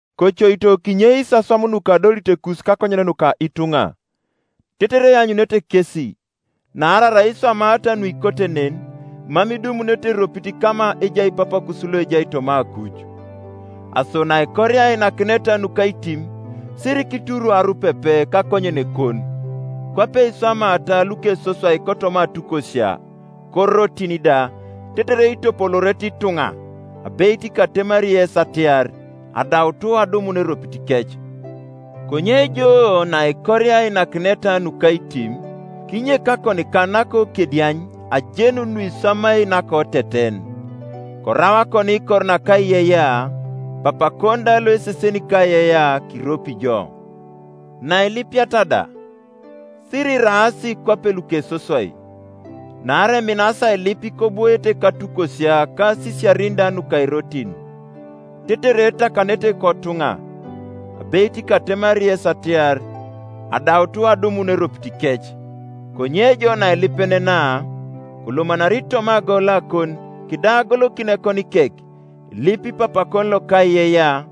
“Kocoito kinyeis aswam nukadolitekus kakonyen nuka ituŋa, tetere eanyunete kesi: naarai arai kiswamata nuikote nen, mam idumunete eropit kama ejai Papakus loejai toma akuj. “Aso naikoria ainakineta nukaitim, sirikituru arupepe kakonyenekon, kwape iswamaata lukesoswai kotoma atukosia, korotin da, tetere itopoloorete ituŋa. Abeit katemari yes atiar, Adaut adumun eropitikec. Konye jo naikoria ainakineta nukaitim, kinyek akonikan nakokediany ajenun nuiswamai nakoteten; korau akoniikor nakaiyeiyea; Papakon da loeseseni kaiyeiyea kiropi jo. “Nailipiata da, siriraas kwapelukesoswai; naarai eminasi ailip kobwoete katukosia ka asisiarin da nuka irotin, tetere etakanete kotuŋa. Abeit katemari yes atiar, Adaut adumun eropitikec. Konye jo nailipenenaa, kolomanari toma agolakon, kidau agolokin ekonikek, kilip Papakon lokaiyeiyea,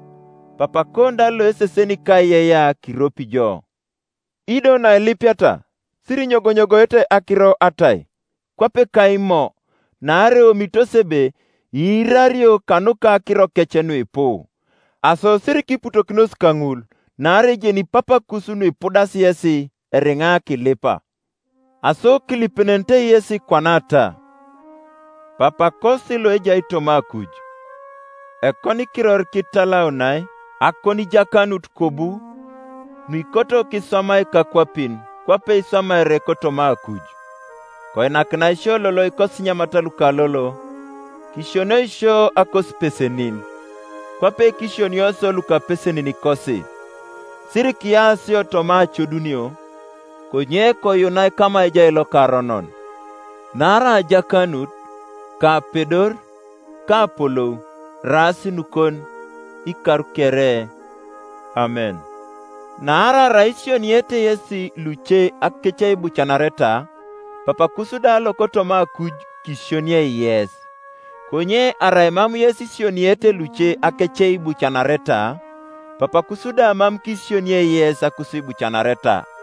Papakon da loeseseni kaiyeiyea kiropi jo. “Ido nailipiata sirinyogonyogoete akiro atai, kwape ka Imo; naarai eomitos ebe iirario kanuka akirokec nuipu. Aso sirikiputokinos kaŋul: naarai ejeni Papakus nuipudasi yesi, eriŋa kilipa. Aso kilipenenete yesi kwanata: Papakosi loejai toma akuj, Ekonikiror kitalaunai. Akonijakanut kobu. Nuikoto kiswamai kakwapin Kwape iswamaere kotoma akuj. Koinakinai sio lolo ikosinyamat luka lolo. Kisionioi sio akosipesenin, Kwape kisionio isio lukapeseninikosi. Sirikiya sio toma acodunio, Konye koyuunai kama ejai lokaronon. [Naarai ajakanut, ka apedor, ka apolou, eraas nukon, ikar kere, Amen.] Naarai arai isioniete yesi luce akeceibucanareta, Papakus da lokotoma akuj kisionie yes. Konye arai mam yes isioniete luce akeceibucanareta, Papakus da mam kisionie yes akusiibucanareta.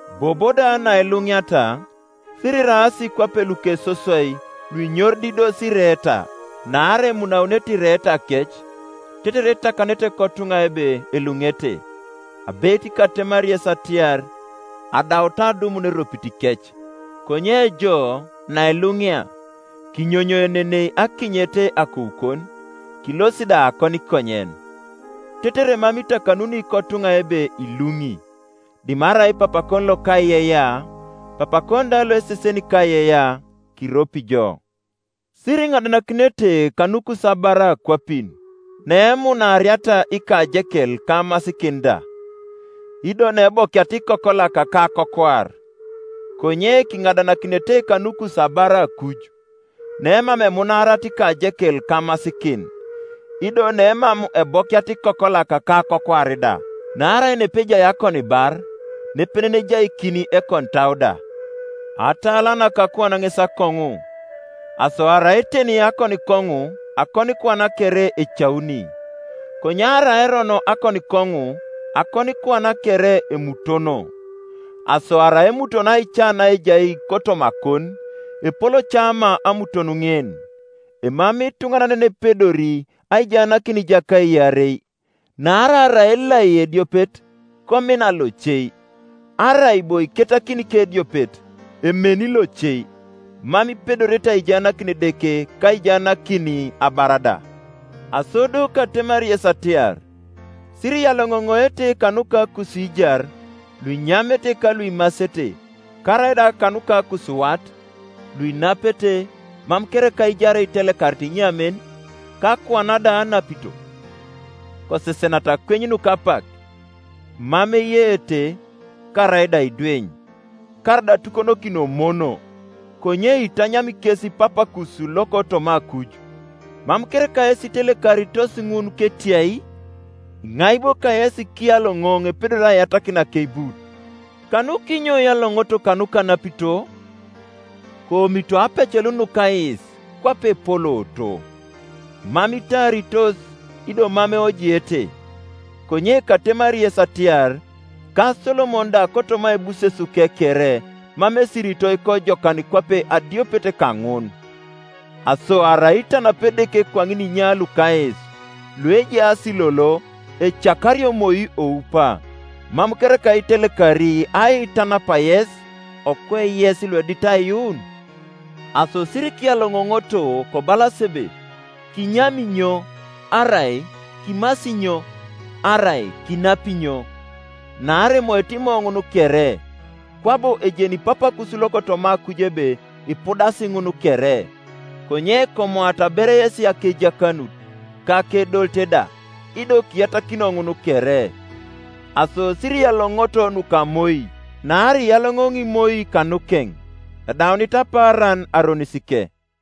“Bobo da nailuŋiata, siriraas kwape lukesoswai luinyorididos ireeta; naarai emunaunete ireetakec, tetere etakanete kotuŋa ebe eluŋete. Abeit katemari yes atiar, Adaut adumun eropitikec. Konye jo, nailuŋia, kinyonyoenenei akinyet akoukon, kilosi da akonikonyen, tetere mam itakanuni kotuŋa ebe iluŋi, dimarai Papakon lokaiyeiyea: Papakon da loeseseni kaiyeiyea, kiropi jo. “Siriŋadanakinete kanukus abar akwapin, neemunaariata ikajekel ka amasikin da, ido neebokiata ikokolak ka akokwaar. Konye kiŋadanakinete kanukus abar akuj, nemam emunaariata ikajekel ka amasikin, ido nemam ebokiata ikokolak ka akokwaar da. Naarai nepejai akonibar, nepenen ejaikin ekonitau da. “Atala naka akuan ŋes akoŋu: aso arai eteni akonikoŋu, akonikuan kere ecauni. Konye arai erono akonikoŋu, akonikuan kere emutono. Aso arai emutono aica naejai kotomakon, epol ca ma amuton ŋin! Emamei ituŋanan yenepedori aijaanakin ijaka iarei; naarai arai elai ediopet, komina loce; arai bo iketakin kediopet, emeni loce. Mam ipedorete aijaanakin Edeke ka aijaanakin abar da. “Aso do katemari yes atiar, Siriyaloŋoŋoete kanuka akusiijar, Iuinyamete ka luimasete; karaida kanuka akusiwat, luinapete. Mam kereka aijar itelekarit inyamen, ka akuan da anapito? Kosesenata akweny nuka apak, mam eyeete, karaida aidweny, karaida atukonokin Emono; konye itanyami kes Papakus lokotoma akuj. Mam kereka yes itelekaritos ŋun ketiai? Iŋai bo kayesi kiyaloŋoŋ epedori aiyatakin akeibut? Kanukinyo iyaloŋoŋooto kanuka anapito? Koomito aapecelun nuka ais, kwape epolooto; mam itaaritos, ido mam eojiete: konye katemari yes atiar, Ka Solomon da kotoma aibusesuke kere mam esiritoi kojokan kwape adiopet kaŋun. Aso arai itanapi Edeke kwaŋin inya luka ais, luejaas lolo, ecakario moi oupa, mam kereka itelekari aitanap yes, okwe yes luedit aiyuun? Aso sirikiyaloŋoŋoto kobalas ebe, ‘Kinyami inyo?’ Arai ‘Kimasi inyo?’ Arai, ‘Kinapi inyo?’ Naarai emoete Imo ŋun kere; kwabo ejeni Papakus lokotoma akuj ebe ipudas ŋun kere. Konye komoata ber yesi akejakanut, ka akedolit da; ido kiyatakinio ŋun kere. “Aso sirikiyaloŋoŋoto nuka moi: naarai iyaloŋoŋi moi kanukeŋ. Edaunit apaaran aronisike.